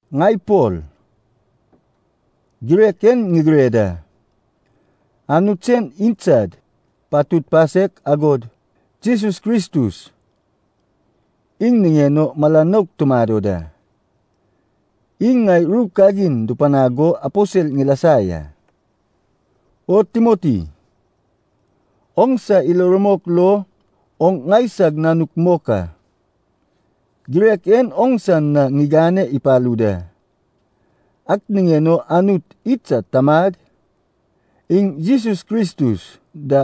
Ŋai Pol, girek en ŋigire da. Anut sen idsad patud pasek, agod Jesus Kristus iŋ niŋen o mala nouk tumado da. Iŋ ŋai ru kagin dupanag go aposel ŋilasa ya. O Timoti, oŋsa ilo rumok lo oŋ ŋaisag nanuk mok a. Girek en oŋsa na ŋigane ipalu da. Ak niŋen o Anut idsad Tamad, iŋ Jesus Kristus da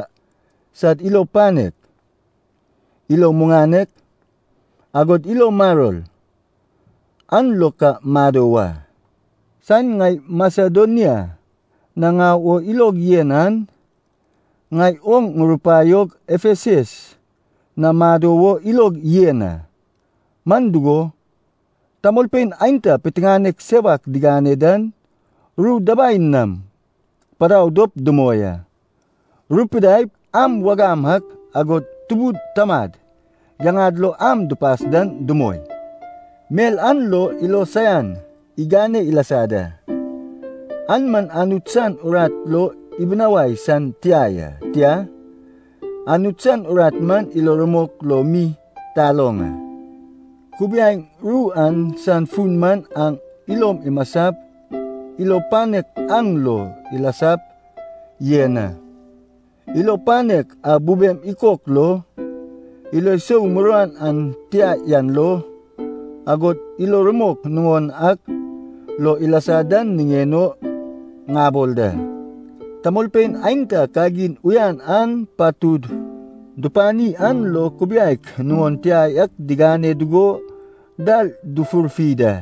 sad ilo panek, ilo muŋanek, agod ilo maror an lo ka mado wa. Saen ŋai Masedonia na ŋau o ilog yen an, ŋai oŋ ŋurupaiog Efesus na mado wo ilog yan a. Man dugo, tamolpein aenta piteŋanek sewak digane dan ru dabai nam padau dop dumoi a. Rupidaip am wagam ak, agod tubud tamad yaŋad lo am dupas dan dumoi. Mel an lo ilo saian igane ilasa da. An man Anut san urat lo ibinawai san tia ya. Tia, Anut san urat man ilo rumok lo mi taloŋ a. Kubiaeŋ ru an san fun man aŋ ilom imasap ilo panek aŋ lo ilasap yen a. Ilo panek a bube ikok lo, ilo sou muruan an tia yan lo, agod ilo rumok nuŋon ak lo ilasa dan niŋen o ŋabol da. Tamolpein aenta kagin uyan an patud dupani an lo kubiaek nuŋon tia yak digane dugo dal dufurfi da.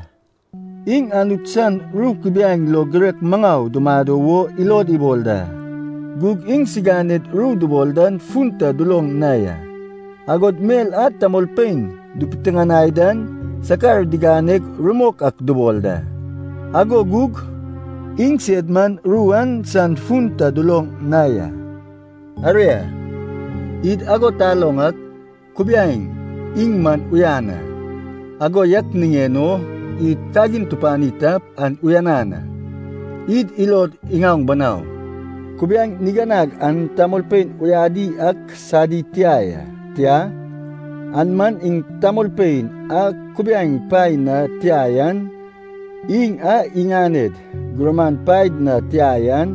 Iŋ Anut san ru kubiaeŋ lo girek maŋau dumado wo ilod ibol da, gug iŋsiganed ru dubol dan fun ta duloŋ na ya. Agod mel a tamolpein dupiteŋanai dan sakar diganeg rumok ak dubol da, ago gug iŋsed man ru an san fun ta duloŋ na ya. Aria, id ago taloŋ ak, kubiaeŋ iŋ man uyan a. Ago yak niŋen o id kagin tupani tap, an uyanan a. Id ilod iŋaoŋ banau, kubiaeŋ niganag an tamolpein uyadi ak sadi tia ya. Tia, an man iŋ tamolpein a kubiaeŋ paen na tia yan, iŋ a iŋaned gurman paed na tia yan,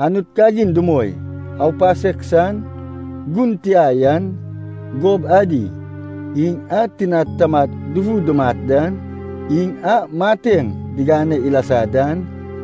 Anut kagin dumoi, aupasek san, gun tia yan, gob adi, iŋ a tinad tamad dufu dumat dan, iŋ a mateŋ digane ilasa dan,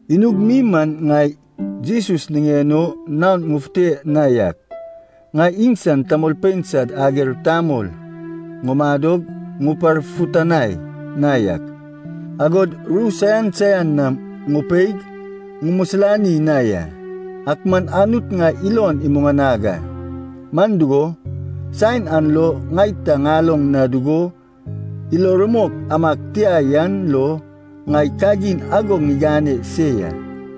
Inug mi man ŋai Jesus niŋen o naon ŋufute na yak, ŋai iŋsan tamolpein sad ager tamol ŋumadog ŋuparfutanai na yak, agod ru saian saian nam ŋupeig ŋumisilani na ya. Ak man Anut ŋai ilon imuŋanag a. Man dugo, saen an lo ŋai ta ŋaloŋ na dugo ilo rumok amag tia yan lo ŋai kagin ago ŋigane se ya.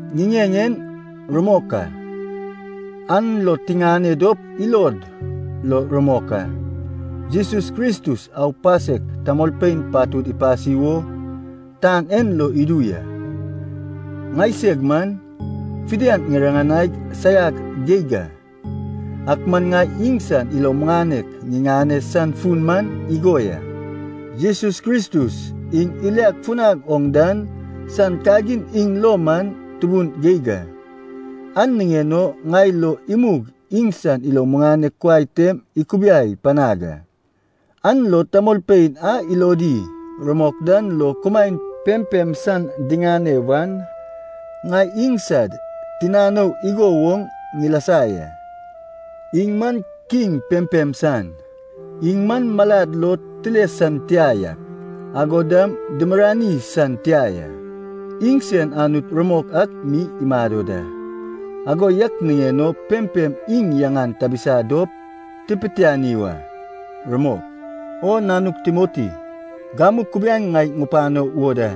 Ŋiŋeŋ en rumok a, an lo tiŋane dop ilod lo rumok a. Jesus Kristus aupasek tamolpein patud ipasi wo tan en lo idu ya. Ŋaiseg man fidian ŋiriŋanaig saiag geig a. Ak man ŋai iŋsan ilo muŋanek ŋiŋane san fun man igo ya. Jesus Kristus iŋ iliad funad oŋ dan san kagin iŋ lo man tubun geig a. An niŋen o ŋai lo imug iŋsan ilo muŋanek kuai tem ikubiai panag a, an lo tamolpein a ilodi rumok dan lo kumaen pempem san diŋane wan, ŋai iŋsad tinanou igo woŋ ŋilasa ya. Iŋ man Kiŋ pempem san. Iŋ man malad lo tile san tia yak, agod dam dimirirani san tia ya. Iŋsen Anut rumok ak mi imado da. Ago yak niŋen o pempem iŋ yaŋan tabisa dop tipitiani wa. Rumok. O nanug Timoti, gamu kubiaeŋ ŋai ŋupano wo da.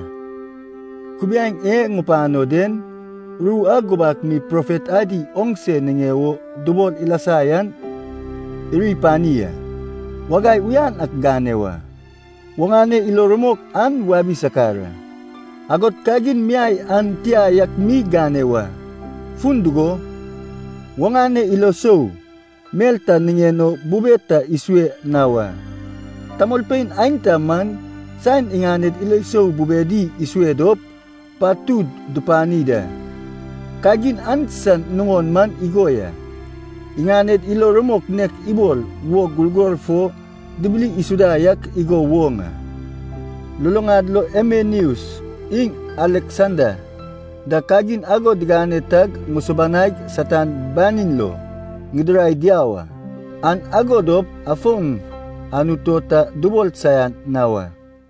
Kubiaeŋ e ŋupano den ru a gubak mi profet adi oŋse niŋe wo dubol ilasa yan iri pani a. Wagai uyan ak gane wa, oŋane ilo rumok an wabi sakar a, agod kagin miai an tia yak mi gane wa, fun dugo, oŋane ilo sou mel ta niŋen o bube ta isue na wa. Tamolpein aenta man saen iŋaned ilo sou bubedi isue dop, patud dupani da. Kagin an san nuŋon man igo ya, iŋaned ilo rumok nek ibol wog gurgor fo dibili isuda yak igo woŋ a. Luluŋad lo Himeneus iŋ Aleksanda da kagin ago digane tag ŋusubanaig Satan banin lo ŋidirai diau a. An ago dop afon Anut o ta dubol saian na wa.